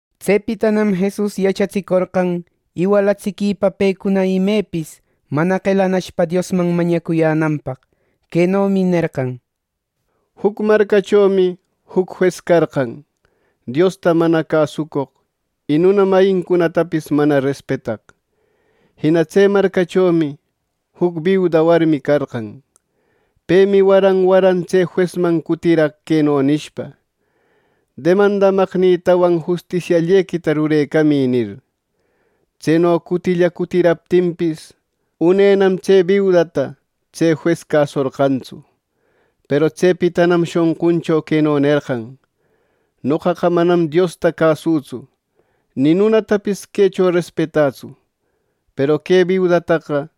Tsepitanam Jesus yachatsicorqan iwalatsiquipa pecuna imepis, mana qelanashpa Diosman mañacuyänanpaq. Quenomi nerqan: “Juc marcachomi juc jues carqan, Diosta mana cäsucoq, y nuna mayincunatapis mana respetaq. Jina tse marcachomi juc biuda warmi carqan. Pemi waran waran tse juesman cutiraq queno nishpa: ‘Demandamaqnïtawan justisiallequita rurecamï’ nir. Tseno cutilla cutiraptinpis, unenam tse biudata tse jues casorqantsu. Peru tsepitanam shonquncho queno nerqan: ‘Noqaqa manam Diosta cäsütsu, ni nunatapis quecho respetätsu; peru que biudataqa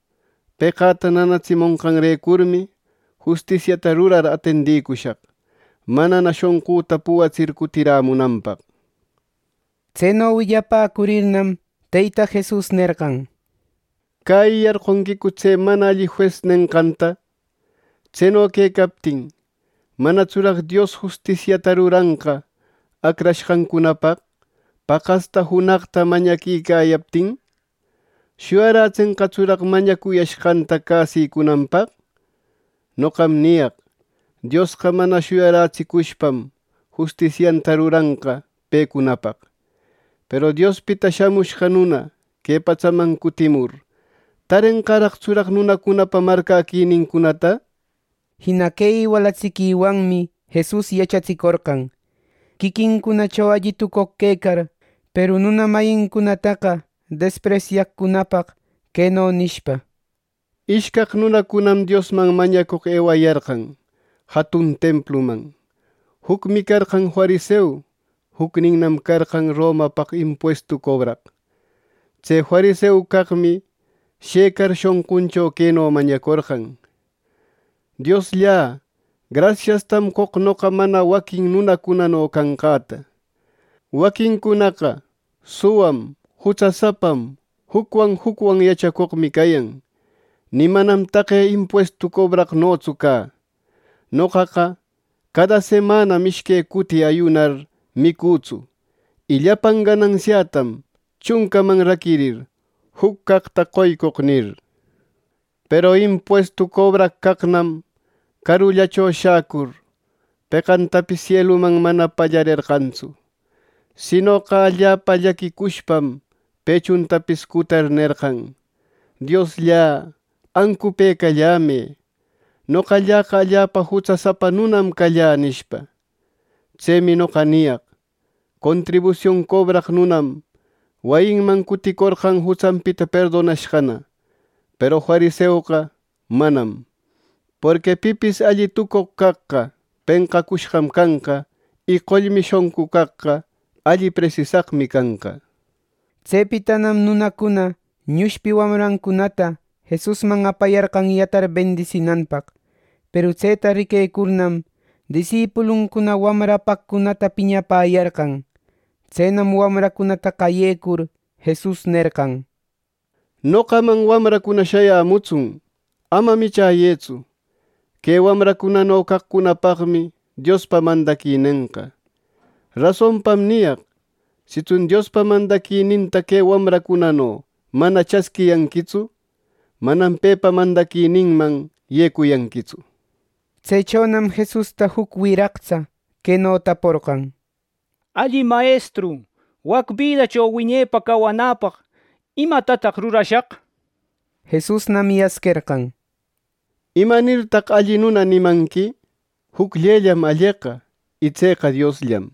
peqäta nanatsimonqanrecurmi, justisiata rurar atendicushaq, manana shonqüta puwatsir cutirämunanpaq.’” Tseno willapäcurirnam, Teyta Jesus nerqan: “¿Cäyiyarqonquicu tse mana alli jues nenqanta? Tseno quecaptin, ¿manatsuraq Dios justisiata ruranqa acrashqancunapaq, paqaspa junaqpa mañaquicayaptin! ¿Shuyarätsenqatsuraq mañacuyashqanta casicunanpaq? Noqam niyaq: Diosqa mana shuyarätsicushpam, justisianta ruranqa pecunapaq. Peru Diospita Shamushqa Nuna que patsaman cutimur, ¿tarenqaraqtsuraq nunacunapa marcäquinincunata?” Jina que iwalatsiquiwanmi Jesus yachatsicorqan, quiquincunacho alli tucoq quecar, peru nuna mayincunataqa despresyaqcunapaq, queno nishpa: “Ishcaq nunacunam Diosman mañacoq ewayarqan jatun templuman: Jucmi carqan fariseu; jucninnam carqan Romapaq impuestu cobraq. Tse fariseu caqmi shëcar, shonquncho queno mañacorqan: ‘Dioslla, grasiastam qoq noqa mana waquin nunacunano canqäta. Waquincunaqa suwam, jutsasapam, jucwan jucwan yachacoqmi cayan. Ni manam taqe impuestu cobraqnotsu cä. Noqaqa cada semanam ishque cuti ayunar micütsu; y llapan gananqätam chuncaman raquirir, juc caqta qoycoq’ nir. Peru impuestu cobraq caqnam carullacho shacur, peqantapis sieluman mana pallarerqantsu. Sinoqa allapa llaquicushpam pechuntapis cutar, nerqan: ‘Diosllä, ancupëcallämë. Noqalläqa allapa jutsasapa nunam callä’ nishpa. Tsemi noqa niyaq: Contribusion cobraq nunam wayinman cuticorqan jutsanpita perdonashqana; peru fariseoqa, manam. Porqui pipis alli tucoq caqqa, penqacushqan canqa; y qollmi shonqu caqqa, alli presisaqmi canqa.” Tsepitanam nunacuna ñushpi wamrancunata Jesusman apayarqan yatar bendisinanpaq. Peru tseta riquecurnam, disipuluncuna wamra apaqcunata piñapäyarqan. Tsenam wamracunata qayecur, Jesus nerqan: —¡Noqaman wamracuna shayämutsun! Ama michäyëtsu. Que wamracunano caqcunapaqmi Diospa mandaquinenqa. Rasonpam niyaq: Sitsun Diospa mandaquininta que wamracunano mana chasquiyanquitsu, manam pepa mandaquininman yecuyanquitsu. Tsechonam Jesusta juc wiraqtsa queno taporqan: —Alli mayestru, wac bidacho wiñepa cawanäpaq, ¿imatataq rurashaq? —nir. Jesusnam yasquerqan: —¿Imanirtaq ‘Alli nuna’ nimanqui? Jucllellam alleqa, y tseqa Diosllam.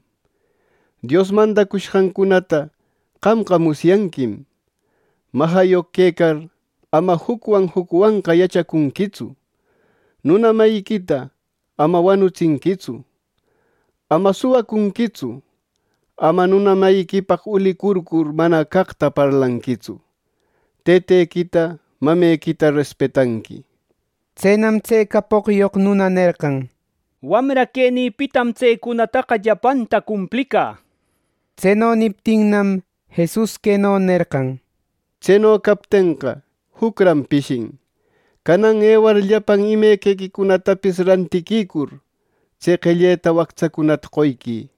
Dios mandacushqancunata qamqa musyanquim: ‘Majayoq quecar, ama jucwan jucwanqa yachacunquitsu; nuna mayiquita ama wanutsinquitsu; ama suwacunquitsu; ama nuna mayiquipaq ulicurcur mana caqta parlanquitsu; tëtequita, mamequita respetanqui’. Tsenam tse capoqyoq nuna nerqan: —Wamra quenïpitam tsecunataqa llapanta cumplicä —nir. Tseno niptinnam, Jesus queno nerqan: —Tseno captenqa, jucran pishin: Canan ewar llapan imequicunatapis rantiquicur, tse qelleta wactsacunata qoyquï.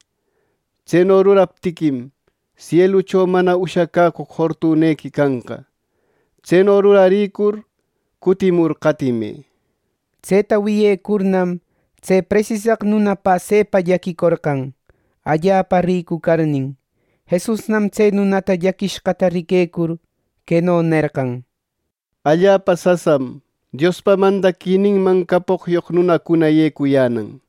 Tseno ruraptiquim, sielucho mana ushacäcoq fortunequi canqa. Tseno rurarïcur, cutimur qatimë —nir. Tseta wiyecurnam, tse presisaq nuna pasepa llaquicorqan, allapa ricu carnin. Jesusnam tse nunata llaquishqata riquecur, queno nerqan: —¡Allapa sasam Diospa mandaquininman capoqyoq nunacuna yecuyänan!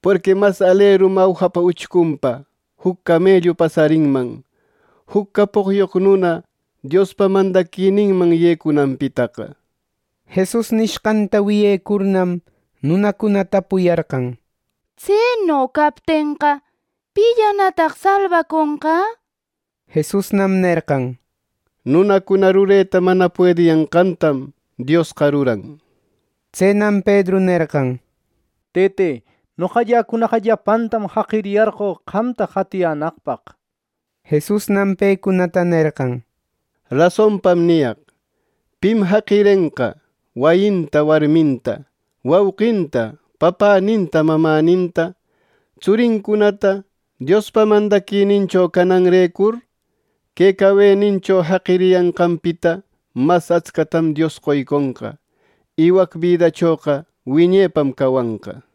¡Porqui mas alerim awjapa uchcunpa juc camellu pasarinman, juc capoqyoq nuna Diospa mandaquininman yecunanpitaqa! —nir. Jesus nishqanta wiyecurnam, nunacuna tapuyarqan: —Tseno captenqa, ¿pillanataq salbaconqa! —nirnin. Jesusnam nerqan: —Nunacuna rureta mana puediyanqantam Diosqa ruran —nir. Tsenam Pedru nerqan: —Tëte, noqalläcunaqa llapantam jaqiriyarqö, qamta qatiyänaqpaq —nir. Jesusnam pecunata nerqan: —Rasonpam niyaq: Pim jaqirenqa wayinta, warminta, wauqinta, papäninta, mamäninta, tsurincunata Diospa mandaquinincho cananrecur, que cawenincho jaqiriyanqanpita mas atscatam Dios qoyconqa; y wac bidachoqa wiñepam cawanqa —nir.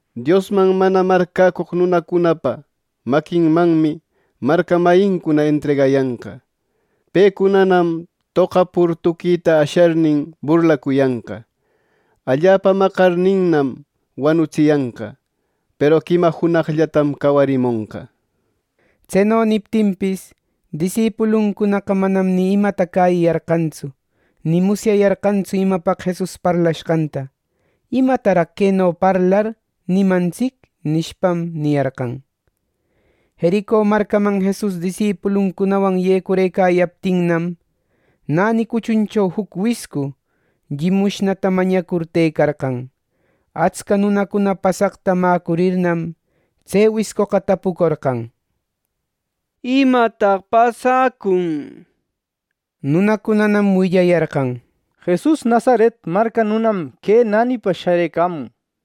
Diosman mana marcäcoq nunacunapa maquinmanmi marca mayincuna entregayanqa. Pecunanam toqapur tuquïta asharnin, burlacuyanqa. Allapa maqarninnam, wanutsiyanqa; peru quima junaqllatam cawarimonqa —nir. Tseno niptinpis, disipuluncunaqa manam ni imata cäyiyarqantsu; ni musyayarqantsu imapaq Jesus parlashqanta “¿Imataraq queno parlar nimantsic?” nishpam, niyarqan. Jerico marcaman Jesus disipuluncunawan yecurëcayaptinnam, näni cuchuncho juc wiscu llimushnata mañacur tëcarqan. Atsca nunacuna pasaqta mäcurirnam, tse wiscoqa tapucorqan: —¿Imataq pasacun? —nir. Nunacunanam willayarqan: —Jesus Nazaret marca nunam que nänipa sharëcamun —nir.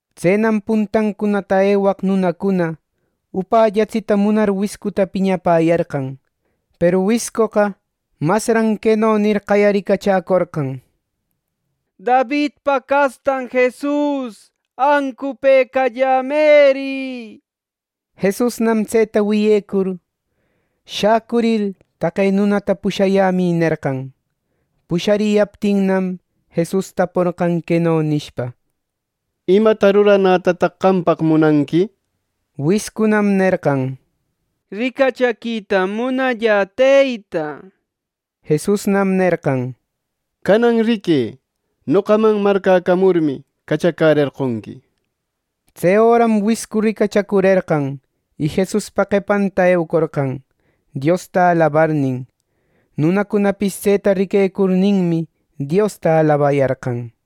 Tsenam puntancunata ewaq nunacuna upällatsita munar wiscuta piñapäyarqan, peru wiscoqa masran queno nir, qayaricachäcorqan: —¡Davidpa castan Jesus, ancupëcallämëri! —nir. Jesusnam tseta wiyecur, shäcurir, “Taqe nunata pushayämï” nerqan. Pushariyaptinnam, Jesus taporqan queno nishpa: —¿Imata ruranätataq qampaq munanqui? —nir. Wiscunam nerqan: —¡Ricachaquitam munallä, Teyta! —nir. Jesusnam nerqan: —Canan riquë. Noqaman marcäcamurmi, cachacärerqonqui. Tse öram wiscu ricachacurerqan, y Jesuspa qepanta eucorqan, Diosta alabarnin. Nunacunapis tseta riquecurninmi, Diosta alabayarqan.